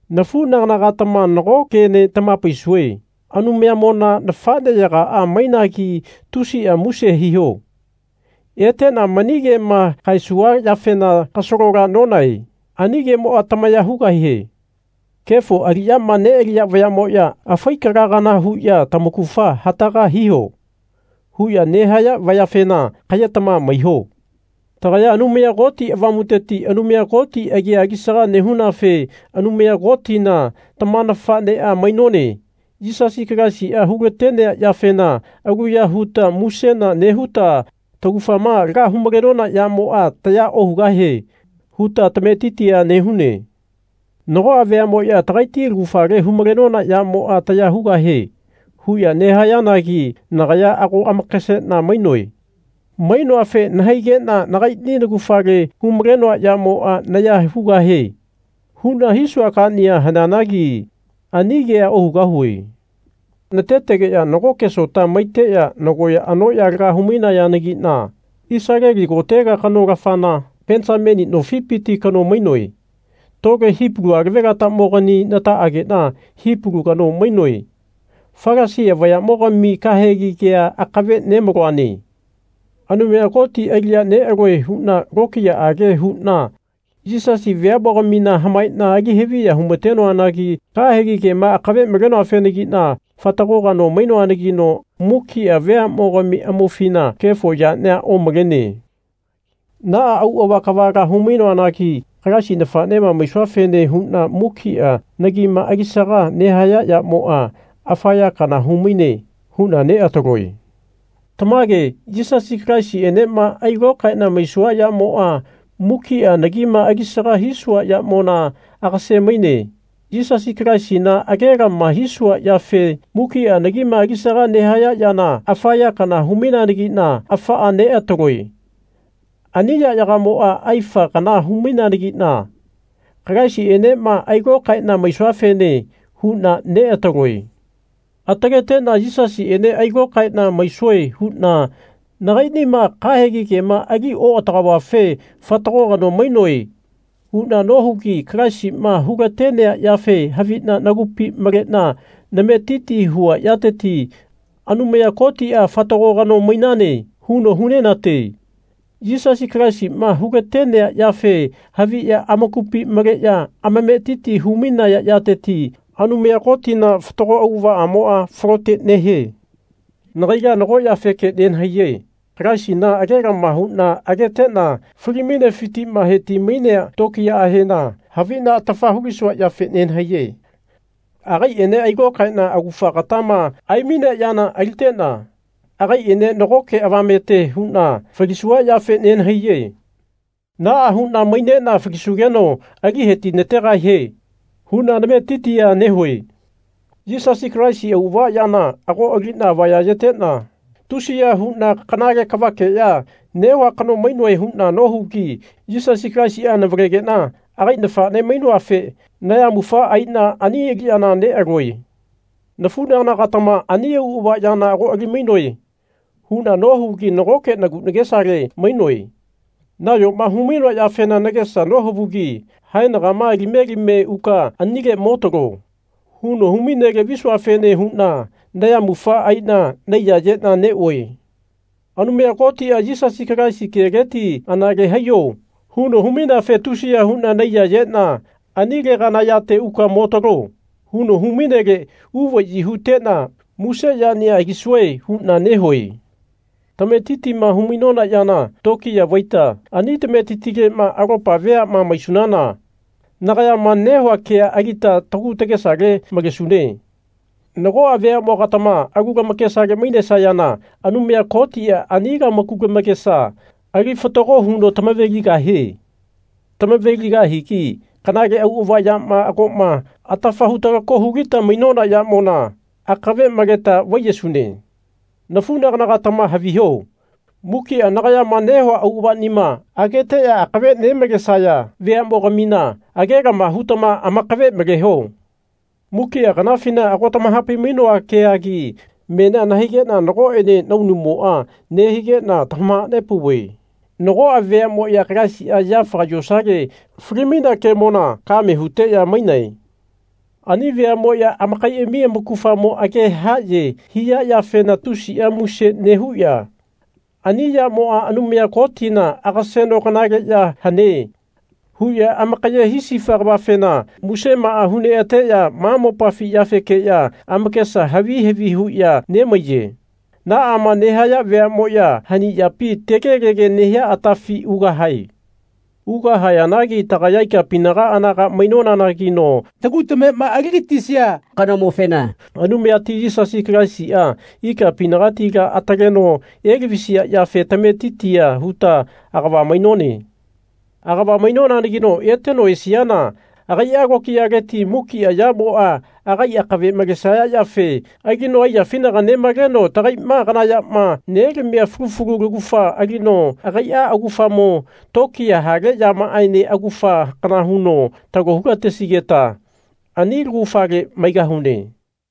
Nafunagana-gatama nago kene tamahapaisue Anumayamona nafaneyagaa mainagi tusia muse hiho. Etena mani kema kaesua yafena kasalola nonahae. Ani kemoa tamaya hugahie. Kefo aliyama nealiya vayamoya afai kala kana huya Tamaugafa hataga hiho. huya nehaya vayafena kayetama maiho. Tagaya Anumaya Koti Avamuteti Anumaya Koti agia alisaga nehunafe Anumaya Kotina tama nafanea mainone. Yisasi Kalaisia hulatenea yafena aluya huta musena nehuta Taugafama laga hu-malenona yamoa taya ohugahie. huta tametitia nehune. Nagoa veamoya Tagaiti laugafale hu-malenona yamoa taya hugahie. huya nehayanagi nagaya ago amakasena mainoe. Mainoafe nahaigena Nagaini naugafale hu-malenoa yamoa naya hugahie. huna hisua kania haneanagi ani kea ohugahue. Natetenoa nagoke sota maiteya nagoya anoya laga hu-mainayanagina Isaleli kotega kano-lafana Penisamini nofipiti kano mainoe. Tole Hipalu alavelatamogani nataagena Hipalu kano mainoe. Falasia vayamogami kahegi kea akave nemaloane. Anumaya Koti aliya nealue huna lokiyaage huna Yisasi veamogamina hamaena ali haviya humatenoanagi kahegi kema akave malenoafenagina fatago kano mainoanagino mukia veamogami amaufina kefo yania omalene. Naa auava kavala humainoanagi Kalaisi nafanema maisuafene huna mukia nagima alisaga nehaya yamoa afa ya kana humaine huna neataloe. Tamage Yisasi Kalaisienema ailokaena maisua yamoa mukia nagima alisaga hisua yamona agase-maine. Yisasi Kalaisina agelama hisua yafe mukia nagima alisaga nehaya yana afa ya kana hu-maineanagina afaa neataloe. Ani yayagamoa aifa kana hu-maineanagina Kalaisienema ailokaena maisuafene huna neataloe. Ataletena Yisasiene ailokaena maisue huna Nagainima kahegi kema ali oatagaovafe fatago kano mainoe. huna nohugi Kalaisima hulatenea yafe havina nagupi malena nametiti hua yateti Anumaya Kotia Fatago kano mainane. huno hunenate. Yisasi Kalaisima hulatenea yafe haviya amakupi maleya amametiti humainaya yateti Anumaya Kotina fatago auavaamoa falote nehie. Nagaila nago yafeke nenahaiye. Kalaisina agelama huna agetena fali-mainefitima heti-mainea tokiyaahena havina atafa hulisua yafe nenahaiye. Agaiene ailokaena augafa agatama aimainea yana alitena agaiene nagoke avamete huna falisua yafe nenahaiye. Naa huna mainena falisugeno ali hetinategahie huna nametitia nehue. Yisasi Kalaisi auava yana ago alina avaya-yetena tusiya huna kanale kavakeya nehua kano mainoe huna nohugi Yisasi Kalaisia navalegena agai nafane mainoafe nayamufa aina ani aliyana nealue. Nafunagana-gatama ani auava yana ago ali-mainoe huna nohugi nagoke nagu nagesale mainoe. Nayoma humainoa yafena nagesa nohavugi haenagama Alime alime uka anile mo talo. huno humainele visuafene huna nayamufa aina naiyayena neue. Anumaya Kotia Yisasi Kalaisi keleti Anale haiyo. huno humaineafe tusiya huna naiyayena Ani legana yate uka mo talo. huno humainele uvayi hutena muse yania alisue huna nehue. Tametitima humainona yana tokiya vaita ani tametitilema alopa veama maisunana nagayama nehua kea alita tagu tagesale malesune. Nagoa veamogatama alu lamakesale mainesayana Anumaya Kotia ani lamaku tamakesa ali fatago huno tamave-ligahie. Tamave-ligahigi kanale auava yama agoma atafa hutalako hulita mainona yamona akave maleta vaiyesune. Nafunagana-gatama haviho mukia nagayama nehua auavanima ageteya akave nemalesaya veamogamina agelama hutama amakave maleho. Mukia kanafina ago tamahapai-mainoa keagi menia nahaigena nagoene naunumoa nehigena tamahanepauve nagoa veamoya Kalaisia yafaga yosale fali-mainea kemona kame huteya mainae. Ani veamoya amakaiami amaugafamo age haye hia yafena tusia muse nehuya Ani yamoa Anumaya Kotina agaseno kanale ya hane. huya amakaye hisifa kavafena musemaa hu neateya ma mopafi yafekeya amakesa havi havi huya nemaiye. Naama nehaya veamoya hani yapi tegelege nehia atafi ugahae. Ugahayanagi tagaya ikapinaga anaga mainonanagino tagu tamema aligatisia kanomofena, Anumayati Yisasi Kalaisia, ikapinagatila ataleno elavisia yafe tametitia huta agava mainone. Agava mainonanagino eteno esiana agaia tokiyaleti mukia yamoa agai akave malesaya yafe alino aiyafinaga nemaleno tagaima kana yama nelamia fulu fulu laugafa alino agaia augafamo tokiya hale yamaaene augafa kana huno talo hulatesigeta ani laugafale maigahune.